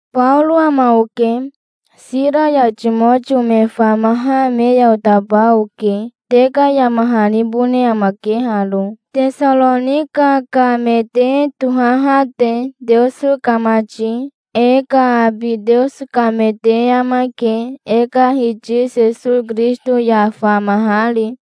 Baoro ama oke. Sira ya Timotio me famaha me ya otaba oke. Te ka yama hanibone amake haro, Tesaronika ka me te tohaha te, Teoso ka mati. E ka abi Teoso ka me te amake, e ka Hiti Sesowi Kirisito ya famahari.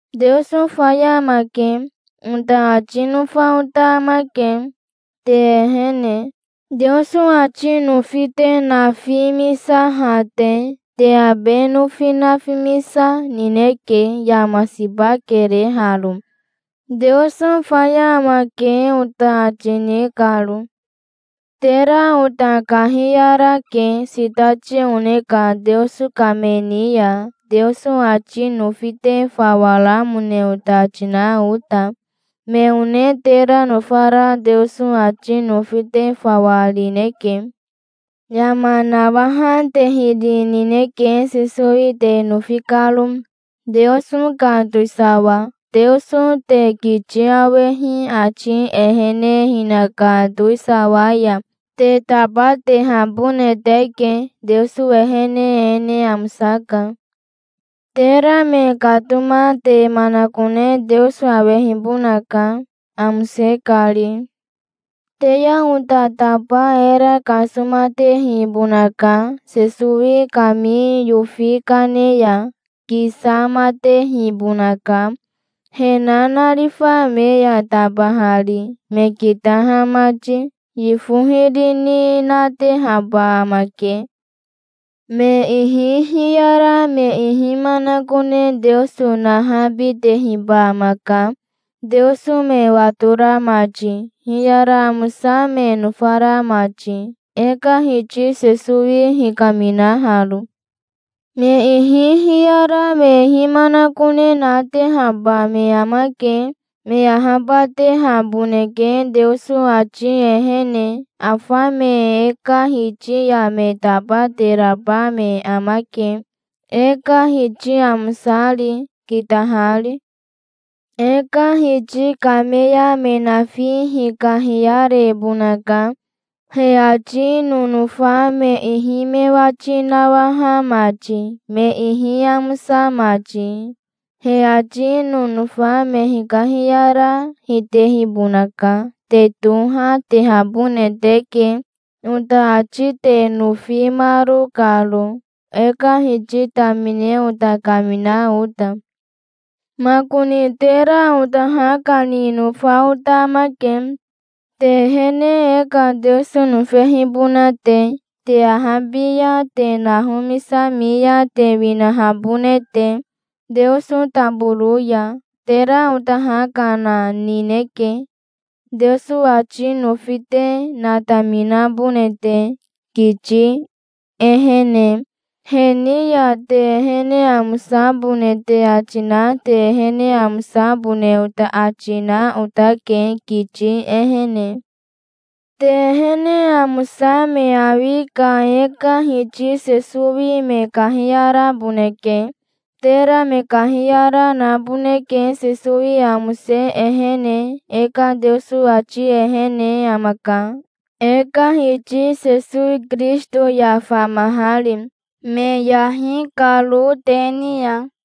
"Teoso faya amake", ota ati nofa ota amake, te ehene, Teoso ati nofi te nafimisaha te. Te abe nofi nafimisa, nineke. Yama siba kere haro, "Teoso faya amake", ota ati ni karo. Tera ota kahiyarake sitati one ka Teoso ka me ni ya, Teoso ati nofi te fawa ramone ota ati na ota. Me one tera nofara Teoso ati nofi te fawa rineke. Yama nawaha te hiri nineke Sesowi te nofi karo, Teoso ka towisawa. Teoso te kiti awehi ati ehene hinaka towisawa ya te tabatehabone teke. Teoso ehene e ne amosaka. Tera me katoma te manakone Teoso awehibonaka, amose kari. Te ya ota taba era kasomatehibonaka, Sesowi kami yofi kane ya. Kisamatehibonaka, he nanarifa me ya tabahari, me kitaha mati. Yifo hiri ni natehaba amake. Me ihi hiyara me ihi manakone Teoso nahabitehiba amaka, Teoso me watora mati, hiyara amosa me nofara mati, e ka Hiti Sesowi hikaminaharo. Me ihi hiyara me ihi manakone natehaba me amake. Me ahabatehaboneke Teoso ati ehene. Afa me e ka Hiti ya me tabateraba me amake, e ka Hiti amosari, kitahari. E ka Hiti kame ya me nafi hikahiyarebonaka, he ati nonofa me ihi me wati nawaha mati, me ihi amosa mati. He ati nonofa me hikahiyara, hitehibonaka. Te toha, tehabone teke, ota ati te nofimaro karo, e ka Hiti tamine ota kamina ota. Makoni tera ota ha kani nofa ota amake, te ehene e ka Teoso nofehibona te, te ahabi ya te nahomisami ya te winahabone te, Teoso taboro ya. Tera ota ha kana nineke, Teoso ati nofi te nataminabone te, kiti ehene. He ni ya te ehene amosabone te ati na te ehene amosabone ota ati na otake, kiti ehene. Te ehene amosa me awi ka e ka Hiti Sesowi me kahiyaraboneke. Tera me kahiyara naboneke Sesowi amose ehene. E ka Teoso ati ehene amaka, e ka Hiti Sesowi Kirisito ya famahari, me yahi karo te ni ya.